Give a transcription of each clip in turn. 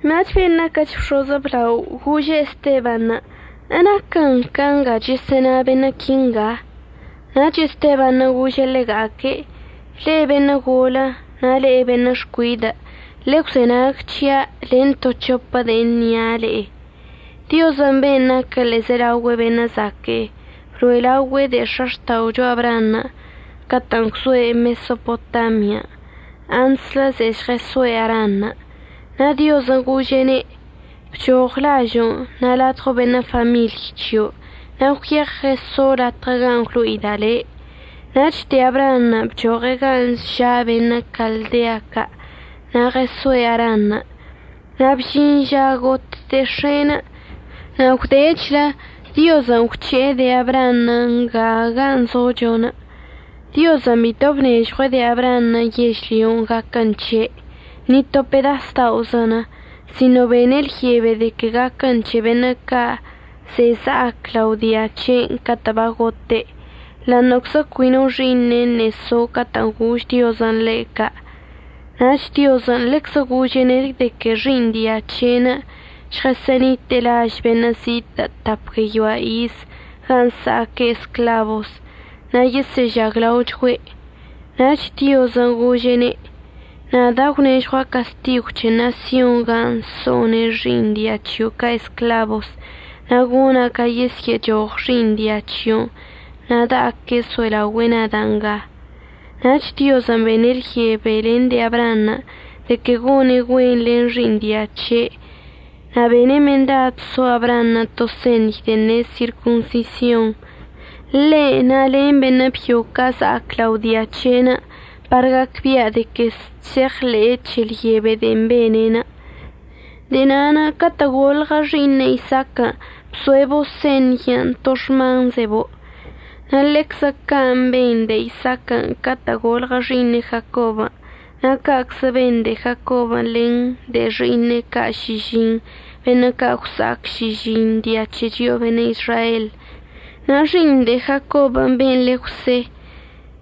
Nach ben' naquəch bx̱oz əblaonə' gože' Estebanṉə': ―¿Enaquən ca nga chəsə'əna beṉə' quinga? Nach Estebanṉə' gože' ḻega'aque': ―Le'e beṉə' golə na' le'e beṉə' xcuidə', ḻegwzenag c̱hia' len to c̱hopə de'e əṉia' le'e. Diozən' ben' naquə ḻe'ezelaogüe beṉə' zaque'e bloe' laogüe' de'e x̱axta'ocho Abraanṉə' catə'ən gwzoe' Mesopotamian' antslə ze'e žɉəsoe' Aranṉə'. Na' Diozən' gože'ene': “Bchoɉ lažo'onə' na' ladɉo beṉə' famiḻy c̱hio' na' gwyeɉ ɉəso' latɉə gan' gwlo'ida' le'.” Nach de'e Abraanṉə' bchoɉe' gan' ža' beṉə' Caldea ca' na' ɉəsoe' Aranṉə'. Na' bžin ža got de'e x̱e'enə' na' gwdechlə Diozən' gwc̱he'e de'e Abraanṉə' nga gan' zocho. Diozən' bito bnežɉue' de'e Abraanṉə' yežlyonə' gaquən c̱he', ni to pedas da'ozən', sino bene' lyebe de que gaquən c̱he beṉə' ca' ze'e za'ac lao dia c̱he'enə' catə' bagote', ḻa'aṉə'əczə cui no xi'iṉe' ṉe'e so catə'ən gož Diozən' ḻe' ca'. Nach Diozən' ḻeczə gože'ene' de que xi'iṉ dia c̱he'enə' žɉəsə'ənite'e laž beṉə' zitə' tap gueyoa iz gan' əsa'aque' esclabos na' yesə'əžaglaochgüe'. Nach Diozən' gože'ene': “Nada' gwnežɉua' castigw c̱he ṉasyonṉə' gan' so'one' xi'iṉ dia c̱hio' ca' esclabos na' gona' ca yesyə'əchoɉ xi'iṉ dia c̱hio'onə' na' da'aque' əso'elaogüe'e nada' nga.” Nach Diozən' bene' lyebe len de'e Abraanṉə' de que gone' güen len xi'iṉ dia c̱he'enə'. Na' bene' mendad so Abraanṉə' to señy de'en ne' sirconsision, ḻe' na' len beṉə' byo ca' za'ac lao dia c̱he'enə' par gacbia' de que chse'eɉḻe'e c̱he lyebe de'en bene'enə'. De'e na'anə' catə' golɉə xi'iṉe' Isaaquən' bzo'ebo' señyən' to xmanzebo', na' ḻeczə can' ben de'e Isaaquən' catə' golɉə xi'iṉe' Jacobən'. Na' ca'aczə ben de'e Jacobən' len de'e xi'iṉe' ca' šižiṉnə' beṉə' ca' gwsa'ac šižiṉ dia c̱he chio'o beṉə' Izrael. Na' xi'iṉ de'e Jacobən' be'en le Jwse,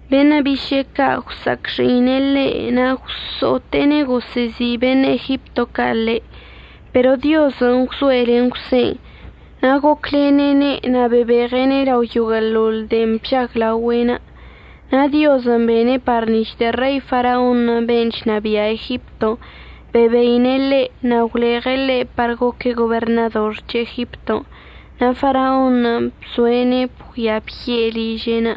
beṉə' biše'e ca' gwsa'acxi'ine' ḻe' na' gwso'ote'ene' gosə'əzi' beṉə' Egipto ca' ḻe'. Pero Diozən' gwzoe' len Jwsen'. Na' goclene'ene' na' bebeɉe'ene' lao yoguə'əḻoḻ de'en bžaglaogüe'enə'. Na' Diozən' bene' par nic̱h de'e Rei Faraonṉə' ben' chnabia' Egipton' bebeine' ḻe' na' gwleɉe' ḻe' par goque' goberṉador c̱he Egipton' na' Faraonṉə' bzo'ene' bgüia bye' ližen'.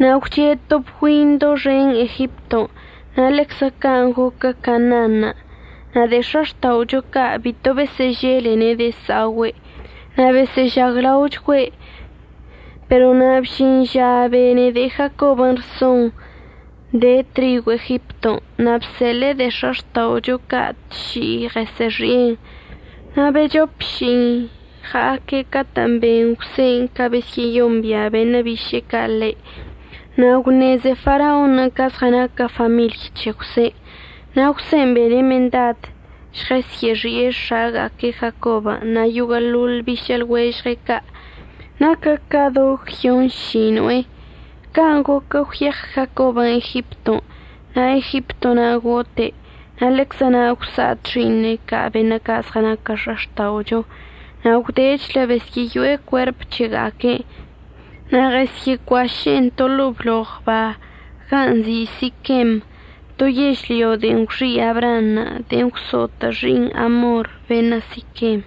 Na' gwche' to bgüin doxen Egipton' na' ḻeczə can' goquə Canaanṉə' na' de'e x̱axta'ocho ca' bito besə'əželene' de'e əsa'ogüe' na' besə'əžaglaochgüe'. Pero na' bžin ža bene de'e Jacobən' rsonṉə' de trigw Egipton' na' bseḻe'e de'e x̱axta'ocho ca' tši'i ɉəsə'əxi'en. Na' bec̱hop ši'i ɉa'aque' catə' ben Jwsen' ca besyə'əyombia' beṉə' biše'e ca' ḻe', na' gwṉeze Faraonṉə' ca zɉənaquə famiḻy c̱he Jwsen'. Na' Jwsen' bene' mendad žɉəsyə'əxi'e x̱aga'aque' Jacobən' na' yoguə'əḻoḻ bišə' lɉuežɉe' ca', naquə ca do gyonšino'e. Can' goquə gwyeɉ Jacobən' Egipton' na' Egipto na' gote', na' ḻeczə na' gwsa'at xi'iṉe' ca' beṉə' ca' zɉənaquə x̱axta'ocho. Na' gwdechlə besyə'əyo'e cuerp c̱hega'aque'enə' na' ɉəsyə'əcuaše'ene' to ḻo'o bloɉ ba gan' nzi' Siquem, to yežlyo de'en gwxi' Abraanṉə' de'en gwso'otə' xi'iṉ Amor beṉə' Siquem.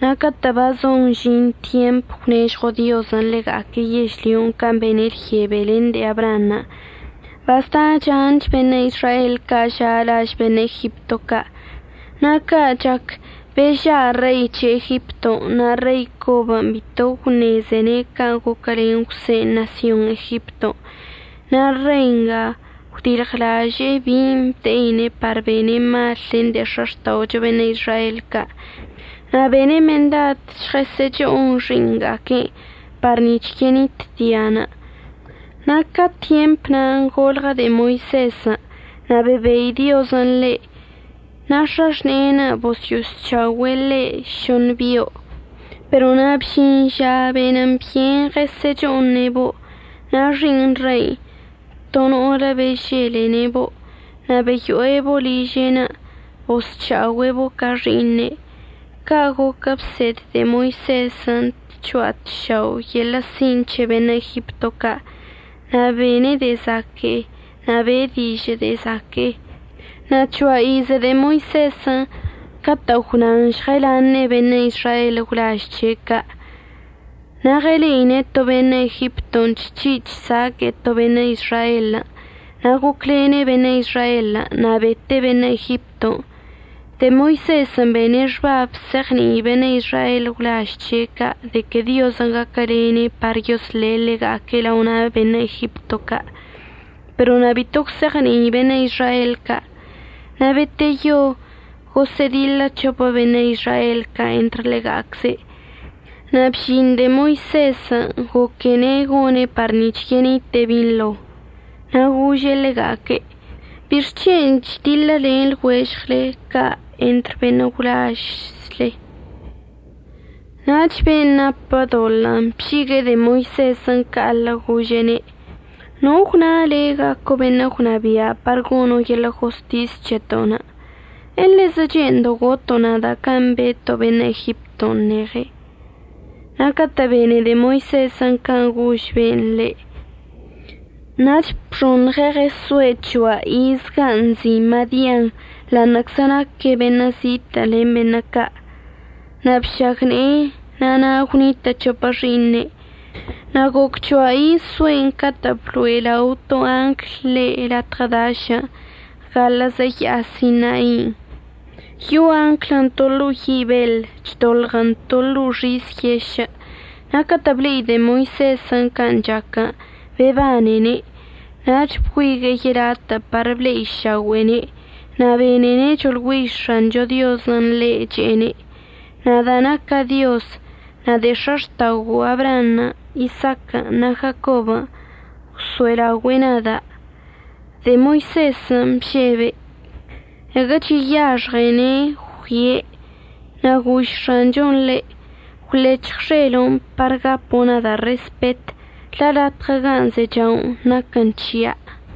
Na' catə' bazon əžin tyemp əgwnežɉo Diozən' ḻega'aque' yežlyon' can' bene' lyebe len de'e Abraanṉə', bazda chan beṉə' Izrael ca' ža' laž beṉə' Egipto ca'. Na' ca' chac beža' rei c̱he Egipton' na' rei cobən' bito gwṉezene' can' goquəlen Jwsen' ṉasyon Egipton'. Na' rei nga gwdilɉlaže'e bin' əbde'ine' par bene' mal len de'e x̱axta'ocho beṉə' Izrael ca', na' bene' mendad žɉəsə'əcho'on xi'iṉga'aque'enə' par nic̱h yenit dianə'. Na' ca tyempən' golɉə de'e Moisezən' na' bebei Diozən' ḻe' na' x̱axne'enə' bosyo'osc̱ha'ogüe' ḻe' šoṉə bio'. Pero na' bžin ža benən byen ɉəsə'əcho'one'ebo', na' xi'iṉ rein' to no'olə beželene'ebo' na' beyo'ebo' liže'enə' bosc̱ha'ogüe'ebo' ca xi'iṉe'. Ca' goquən' bsed de'e Moisezən' tcho'a tšao' yeḻə' sin' c̱he beṉə' Egipto ca', na' bene' de'e zaque'e na' be'e dižə' de'e zaque'e. Na' c̱hoa ize de'e Moisezən' catə' gwnan žɉəlaṉe'e beṉə' Izrael gwlaž c̱he' ca'. Na' ɉəle'ine' to beṉə' Egipton' chc̱hi' chsaque'e to beṉə' Izraelən', na' goclene' beṉə' Izraelən' na' bete' beṉə' Egipton'. De'e Moisezən' bene' xbab se'eɉni'i beṉə' Izrael gwlaž c̱he' ca' de que Diozən' gaquəlene'ene' par yosle' ḻega'aque' lao na' beṉə' Egipto ca', pero na' bito gwse'eɉni'i beṉə' Izrael ca'. Na' beteyo gosə'ədiḻə c̱hopə beṉə' Izrael ca' entr ḻega'acze'. Na' bžin de'e Moisezən' goquene' gone' par nic̱h yenite'e binḻo, na' gože' ḻega'aque': “¿Bixc̱hen' chdiḻəlen lɉuežɉle ca' entr beṉə' gwlažzle?” Nach ben' napə doḻə'ənə' bžigue'e de'e Moisezən' ca'aḻə gože'ene': “¿No gwna le' gaco' beṉə' gwnabia' par gono' yeḻə' jostis c̱heto'onə'? ¿Elezə che'endo' goto' nada' can' beto' beṉə' Egipton' ṉeɉen'?” Na' catə' bene de'e Moisezən' can' gož be'enə' ḻe', nach bxoṉɉe' ɉəsoe' c̱hoa iz gan' nzi' Madian ḻa'aṉə'əczə naque' beṉə' zitə' len beṉə' ca'. Na' bšagne'e na' na' gwnitə' c̱hopə xi'iṉe'. Na' goc c̱hoa iz zoe'enə' catə' bloe' lao to angl ḻe' latɉə dašən' gaḻə'əzə ya'a Sinai. Yo'o anglən' to ḻo'o yi' beḻ chdolɉən to ḻo'o xis yešə'. Na' catə' ble'i de'e Moisezən' can' chaquən' bebanene', nach bgüigue'e yelatə' par ble'iša'ogüe'ene' na' benene' choḻgüiž X̱ancho Diozən' ḻe' che'ene': “Nada' naca' Dioz na' de'e x̱axta'ogo'o Abraanṉə', Isaaquən' na' Jacobən' gwso'elaogüe'e nada'.” De'e Moisezən' bžebe', caguə cheyaxɉene' əggüie'. Na' gož X̱anchon' ḻe': “Gwlec̱hɉ xelo'onə' par gapo' nada' respet la' latɉə gan' zecha'onə' naquən c̱hia'.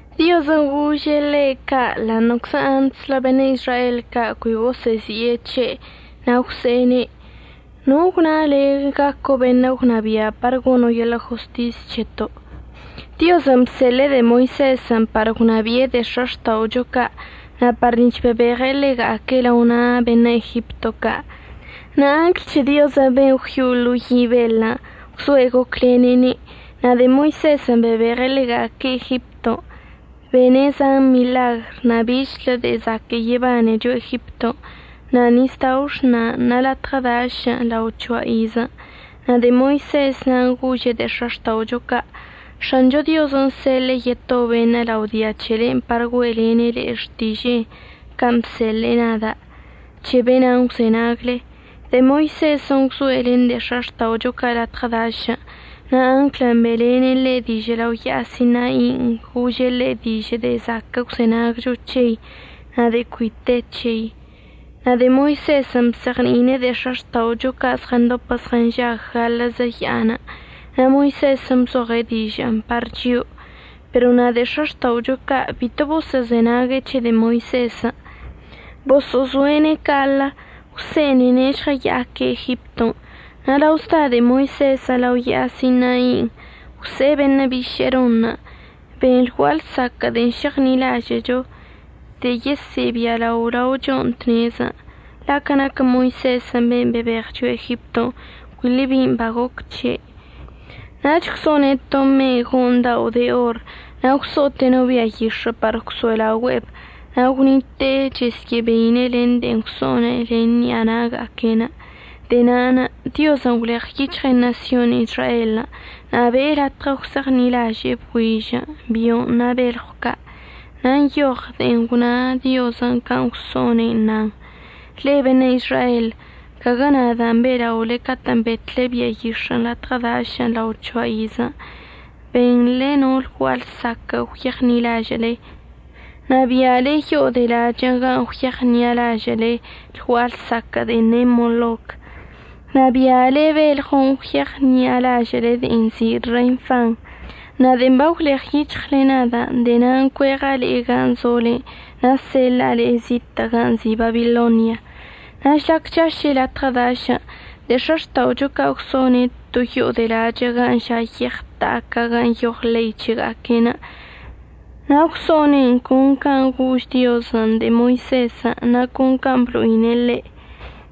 Diozən' gože'ene' ca' ḻa'aṉə'əczə antslə beṉə' Izrael ca' cui gosə'əzi'e c̱he' na' gwse'ene': “¿No gwna le' gaco' beṉə' gwnabia' par gono' yeḻə' jostis c̱heto'?” Diozən' bseḻe'e de'e Moisezən' par gwnabi'e de'e x̱axta'ocho ca' na' par nic̱h bebeɉe' ḻega'aque' lao na' beṉə' Egipto ca', na' angl c̱he Diozən' ben' gwyo'o ḻo'o yi' beḻən' gwzoe' goclene'ene'. Na' de'e Moisezən' bebeɉe' ḻega'aque' Egipton' bene' zan miḻagr na' bichlə de'e zaquə' yebanecho Egipton', na' nisdao' Exṉan' na' latɉə dašən' lao c̱hoa iz. Na' de'e Moisez na'anə' gože' de'e x̱axta'ocho ca': “X̱ancho Diozən' seḻe'e yeto beṉə' lao dia c̱hele par güe'elene' le'e xtiže'enə' can' bseḻe'e nada'. C̱he be'enan' əgwzenagle.” De'e Moisezən' gwzoe' len de'e x̱axta'ocho ca' latɉə dašən'. Na' anglən' be'elene' ḻe' dižə' lao ya'a Sinain' gože' ḻe' dižə' de'e zaquə' əgwzenagcho c̱hei na' de'e cui te c̱hei. Na' de'e Moisezən' bzeɉni'ine'en de'e x̱axta'ocho ca' zɉəndopə zɉənžag gaḻə'əzə ya'anə'. na' Moisezən' bzoɉe' dižə'ənə' par chio'o. Pero na' de'e x̱axta'ocho ca' bito boso'ozenague' c̱he de'e Moisezən', boso'ozo'ene' ca'aḻə. Gwse'enene' žɉəya'aque' Egipton'. Na' lao zda de'e Moisezən' lao ya'a Sinain', gwse'e beṉə' biše'e Ronṉə': “Ben lgua'a lsaquə' de'en šeɉṉi'alažə'əcho, de'e yesə'əbialao lao chio'o tnezən'. La' ca naquə Moisezən' ben' bebeɉ chio'o Egipton' cuili bin' bagoc c̱he'.” Nach gwso'one' to me'e go'oṉ dao' de or na' gwso'ote' no bia yix̱ə' par gwso'elaogüe'eb na' gwnite'e chesyə'əbeine' len de'en gwso'one' len ṉi'a na'aga'aque'enə'. De'e na'anə' Diozən' gwleɉyic̱hɉe' ṉasyon Izraelən' na' be'e latɉə gwse'eɉṉi'alaže'e bgüižən', bio'onə' na' belɉw ca'. Na' nyoɉ de'en gwna Diozən' can' gwso'one' nan: Le'e beṉə' Izrael, caguə nadan' be'ela'ole catə'ən betle bia yix̱ə' latɉə dažən' lao c̱hoa iz. Benḻe no lgua'a lsaquə'ən gwyeɉṉi'alažə'əle, na' bi'ale yo'o de lachə'ən gan' gwyeɉṉi'alažə'əle lgua'a lsaquə' de'en ne' Moloc, na' bi'ale belɉon' gwyeɉṉi'alažə'əle de'en nzi' Renfan. Na' de'en bagwleɉyic̱hɉle nada' de'e na'anə' cueɉa' le'e gan' zolen' na' seḻa'a le'e zitə' gan' nzi' Babilonia. Na' žlac chaše' latɉə dašən' de'e x̱axta'ocho ca' gwso'one' to yo'o de lachə' gan' ža' yeɉ ta'a ca' gan' nyoɉ ḻei c̱hega'aque'enə'. Na' gwso'one'en con can' gož Diozən' de'e Moisezən' na' con can' blo'ine' ḻe'.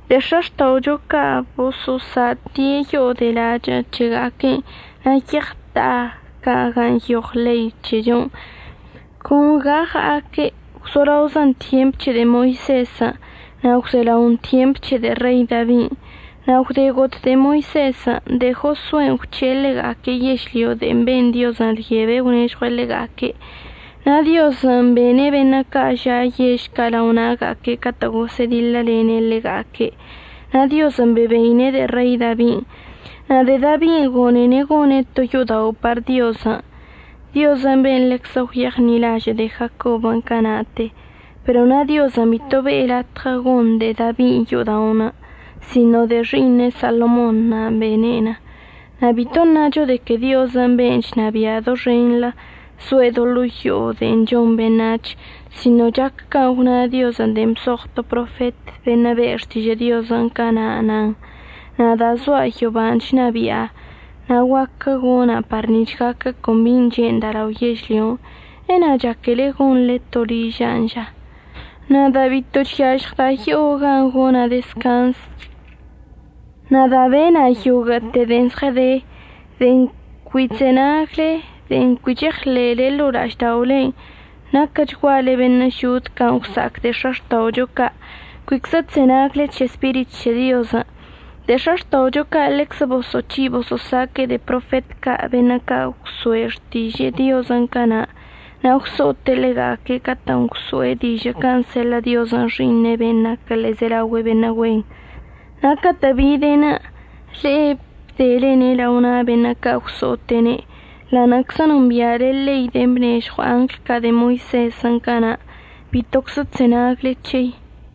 De'e x̱axta'ocho ca' boso'osa'ate' yo'o de'e lachə' c̱hega'aque'enə' na' yeɉ ta'a ca' gan' nyoɉ ḻei c̱hechonə' con ga ɉa'aque', gwzolaozən tyemp c̱he de'e Moisezən' na' gwzelaon tyemp c̱he de'e Rei Dabin'. Na' gwde got de'e Moisezən' de'e Josuen' gwc̱he'e ḻega'aque' yežlyon' de'en ben Diozən' lyebe gwnežɉue' ḻega'aque', na' Diozən' bene' beṉə' ca' ža' yež ca' lao na'aga'aque' catə' gosə'ədiḻəlene' ḻega'aque'. Na' Diozən' bebeine' de'e Rei Dabin', na' de'e Dabin' gone'ene' gone' to yo'odao' par Diozən', Dioz ben' ḻeczə gwyeɉṉi'alažə' de'e Jacobən' cana'ate. Pero na' Diozən' bito be'e latɉə gon de'e Dabin' yo'oda'onə', sino de'e xi'iṉe' Salomonṉə' bene'en. Na' bito əṉacho de que Diozən' ben' chnabia' doxenḻə zoe' do ḻo'o yo'o de'e chon beṉac̱hən', sino chac can' gwna Diozən' de'en bzoɉ to profet beṉə' be' xtiže'enə' cana' nan: Nada' zoa' yoban' chnabia' na' guaquə gona' par nic̱h gaquə con bin' che'enda' lao yežlyon'. ¿Ena' chaquele gonḻe to liža'anə' ža? Nada' bito chyažɉda' yo'o gan' gona' dezcanz. Nada' bena' yoguə'əte de'e zɉəde. De'en cui chzenagle, de'en cui cheɉḻe'ele ḻo'o la'ažda'olen' naquəchguale beṉə' žod can' gwsa'ac de'e x̱axta'ocho ca'. Cuiczə chzenagle c̱he Spirit c̱he Diozən'. De'e x̱axta'ocho ca' ḻeczə boso'oc̱hi' boso'osaque'e de'e profet ca' beṉə' ca' gwso'e xtižə' Diozən' cana' na' gwso'ote' ḻega'aque' catə'ən gwso'e dižə' can' seḻə' Diozən' Xi'iṉe'enə' ben' naquə ḻe'ezelaogüe beṉə' güen. Na' catə' bide'enə' le'e əbdelene' lao na' beṉə' ca' gwso'ote'ene'. Ḻa'aṉə'əczə nombi'ale ḻein de'en bnežɉw angl ca' de'e Moisezən' cana', bitoczə chzenagle c̱hei.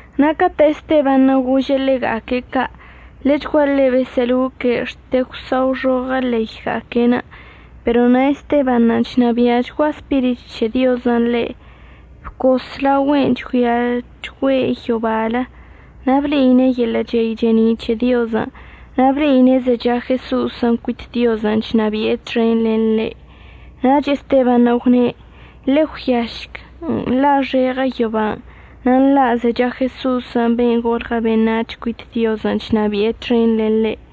Na' catə' Estebanṉə' gože' ḻega'aque' ca' ḻechguaḻe besə'əloque' xte gwsa'oxoɉə leyga'aque'enə'. Pero na' Estebanṉə' chnabi'achgua Spirit c̱he Diozən' ḻe', bcos laogüe'en chgüiachgüe' yobalən' na' ble'ine' yeḻə' chey che'eni' c̱he Diozən' na' ble'ine' zecha Jeso'osən' cuit Diozən' chnabi'e txen len ḻe'. Nach Estebanṉə' gwne': ―Ḻe'e ggüiašc nḻa'axeɉə yoban' na' nḻa' zecha Jeso'osən' ben' golɉə beṉac̱h cuit Diozən' chnabi'e txen len ḻe'.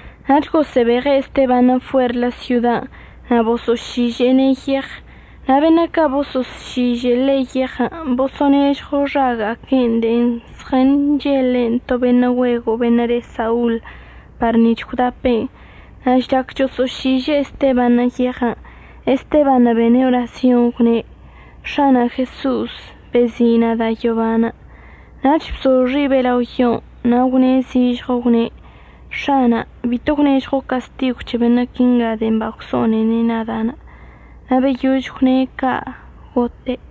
Nach gosə'əbeɉe' Estebanṉə' fuerlə syodan' na' boso'ošiže'ene' yeɉ. Na' beṉə' ca' boso'ošižə ḻe' yeɉən' boso'onežɉo xaga'aquen' de'en zɉənchele'enə' to beṉə' güego' beṉə' le Saul par nic̱h gwdape'en. Na' žlac choso'ošiže'e Estebanṉə' yeɉən', Estebanṉə' bene' orasyonṉə' gwne': ―X̱ana' Jeso'os, bezi' nada' yoban'. Nach bzo xibe' lao yon' na' gwṉe' zižɉo gwne': ―X̱ana' bito gwnežɉo' castigw c̱he beṉə' quinga de'en bagwso'onene' nada'. Na' beyož gwne' ca', gote'.